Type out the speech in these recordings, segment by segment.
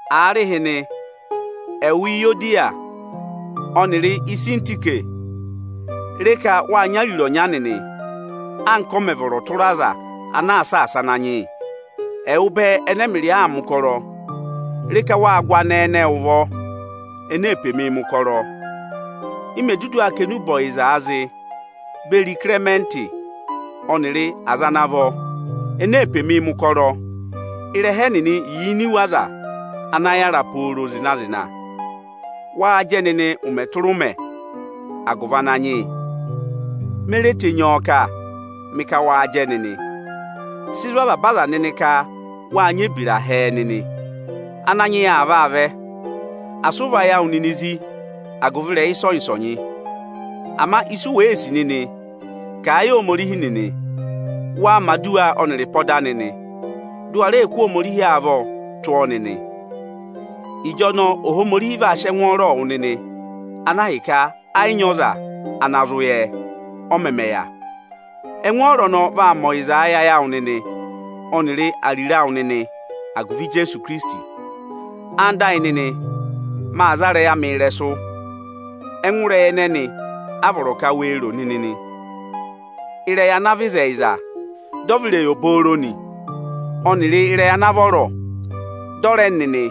Aarịhịnị, ẹwụ Iyodiya ọnịrị Isintike, re ka waa nyị ariro ọnya nịnị, anka ọ mẹ̀ vọrọ tụra aza ana aa saasa Ananyị yị. Ẹwụ bẹẹ ẹnẹ ẹmịrị aa mẹ̀ ụkọrọ, re ka wáa gụ anẹẹ ẹnẹẹ ụvọ, ene pe mi mẹ̀ ụkọrọ, ị mẹ̀ dudu aa kà enube ọyịzaa zị beri Ịkịrẹmẹntị ọnịrị aza ana vọ ene pe mi mẹ̀ ụkọrọ; ịrẹha ẹnịnị yà ini iwe aza ana yara pooro zịna-zịna. Waa jẹ nịnị ụmẹ tụra ụmẹ agụvị Ananyị yị. Me re tenyi ọ kà, mị ka waa jẹ nịnị. Sị zụ̀ avaba aza nịnị ka waa nyị ebira hẹẹ nịnị. Ananyị yị aa vaa vẹ. Asị ụ và ayị awụ nịnị zi agụvị ịrẹyị ịsọnyị-ịsọnyị. Ama ịsị wèee sì nịnị, kà a yị Ohomorihi nịnị. Waa mẹ̀ aduwa ọnịrị ịpọda nịnị, dị ụ wa rẹ kụ́ Ohomorihi avọọ tụ́ ọ nịnị. Ịjọnọọ Ohomorihi vaa sị ẹngwọọrọọ wụ nịnị, ana ahịka ẹ yị nyị ọza ana zụ yẹ, ọ mẹmẹ yà. Ẹngwọọrọ ọnọọ vaa mẹ ọyịza ẹ yị ayị awụ ọnịrị ariro awụ nịnị agụvị Ijeesu Ikirisiti. Ẹwụ nịnị ẹyịnyara amị, maa za ịrẹyị amị ịrẹsụ. Ẹngụ ịrẹyị ẹnẹnị a vọrọ ka wee ro nịnị nị: ịrẹyị ana àa vị ịzẹyịza, dị ọ vị ịrẹyị obooro nị, ọnịrị ịrẹyị ana àa vọrọ, dị ọ rẹ nị nị,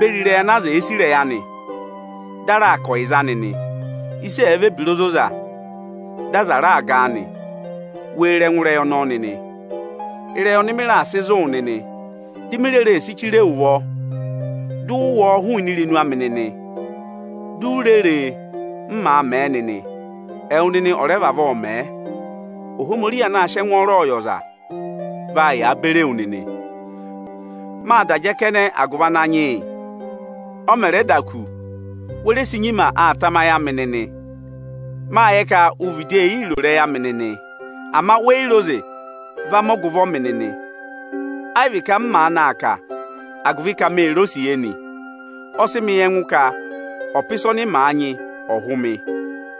beri ịrẹyị ana aza èe sì ịrẹyị anị, dị a raa kà ọyịza anị nị; ịsị ẹ̀ẹ vị ebira ozoza, dị aza raa ga a nị, wee ro ẹngụ ịrẹyị ọnọọ nịnị. Ịrẹyị ọnị mị raà sị zụ̀ wụ nịnị, di mi reè si chire wu nịnị ụvọ, dị ụ wụ́ ọọ hụụnị irenu amị nịnị, di u re re, m màa mẹ̀ ẹ nịnị, ẹwụ nịnị ọ̀ rẹ vavọọ mẹ̀ ẹ. Ohomorihi anaā sịị ẹngwọọrọ yị ọza, vaa yàa beri ewu nịnị. Máa da jẹ kẹnẹ agụvị Ananyị yị. Ọ mẹ̀ rẹ da kù, we re si nyima aa tama ayị amị nịnị. Máa yẹ ka u vịdị ee yii ro ịrẹyị amị nịnị, ama we yi re oze va mẹ ọgụvọ mị nịnị. Ẹ yị vị ka m maanị aa kà a agụvị ka mee re osiye nị. Ọ sị mị yẹ ẹngụ ka ọpa ịsa ọnị maa nyị ọ̀ hụ mị.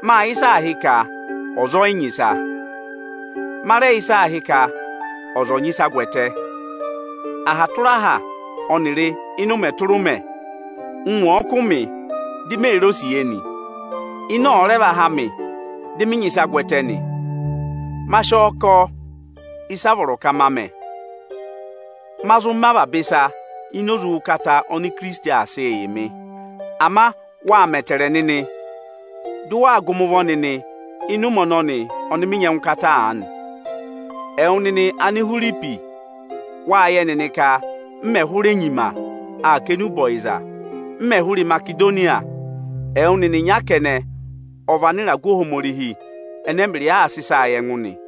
Máa yẹ ịsị aā hị́ ka ọza ọ̀ nyị ịsa. Ma rẹ yẹ ịsị aā hị́ ka ọza ọ́ yị nyị ịsa gwẹtẹ. Aha tụra aha ọnịrị ụmẹ tụra ụmẹ, ụngwẹ ọ̀ọ kụ́ mị di mee re osiye nị, ịnẹ ọ̀ọ rẹ va há mị dị nyị ịsa gwẹtẹ nị, ma sị ọ kọ ịsa a vọrọ ka maa mẹ̀. Ma zụ mẹ avaba ịsa ini oze ụkata oni Ikirisiti aa sịị yị mị. Ama wâ mẹẹ ẹtẹẹrẹ nịnị dị ụ waa gụ mị ụvọ nịnị ịnị ụmẹ ọnọnị ọnị mị nyị ẹngụkata aanị. Ẹwụ nịnị Anihwiripi, wáa yẹ nịnị ka m me hụrẹ nyima aa kà enube ọyịza m mẹ̀ hụrị Imasedoniya, ẹwụ nịnị ịnya kẹnẹ ọ vị anịragụ Ohomorihi ẹnẹ ẹmịrịị aa sị ịsaa yị ẹngụ nị.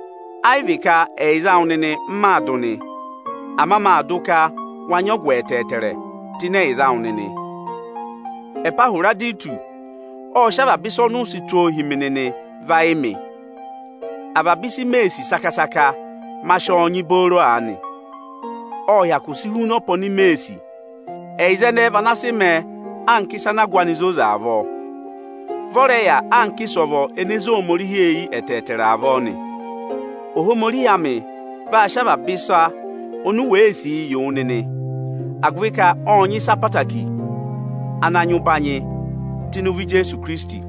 Ẹ yị vị ka ẹyịza awụ nịnị m maa dụ nị, ama maa dụ ka wa nyị ọgụ ẹtẹẹtẹrẹ tụ́ ịnị ẹyịza awụ nịnị. Ẹpahwịrọdịtụsị ộ sị avaba ịsa ọnị ụ sị tụ́ ọ va yị mị. Avaba ịsị mee sì saka-saka, ma sị ọ nyị booro aanị; ọ́ọ hyakụ si huna ọpa oni mee sì. Ẹyịza ẹnẹẹ vị ana sị mẹẹ anka ịsa ana ahụ anị zoza avọọ; vị ọ rẹ yà anka ịsọvọ ene zé Ohomorihi eyi ẹtẹẹtẹrẹ avọọ nị. Ohomorihi amị vaa sị avaba ịsa oni wee sìi yị wụ nịnị, agụvị ka ọ́ọ nyị ịsa ẹtẹẹtẹrẹ ana nyị ụbanyị tụ́ ịnị ụvọ Ijeesu Ikirisiti.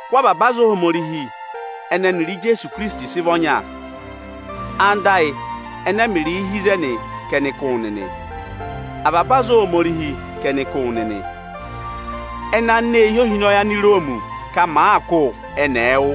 Kụ́ avaba aza Ohomorihi ẹnẹ ẹnịrị Ijeesu Ikirisiti sị vị ọnya. Anda ayị ẹnẹ ẹmịrịị hi ịzẹnị ka ẹnị kụ́ wụ nịnị. Avaba aza Ohomorihi ka ẹnị kụ́ wụ nịnị. Ẹnị anineehi ohinọyị Aniroomi ka màaa kụ́ wụ nịnị, ẹnị ẹ̀ẹ wụ́.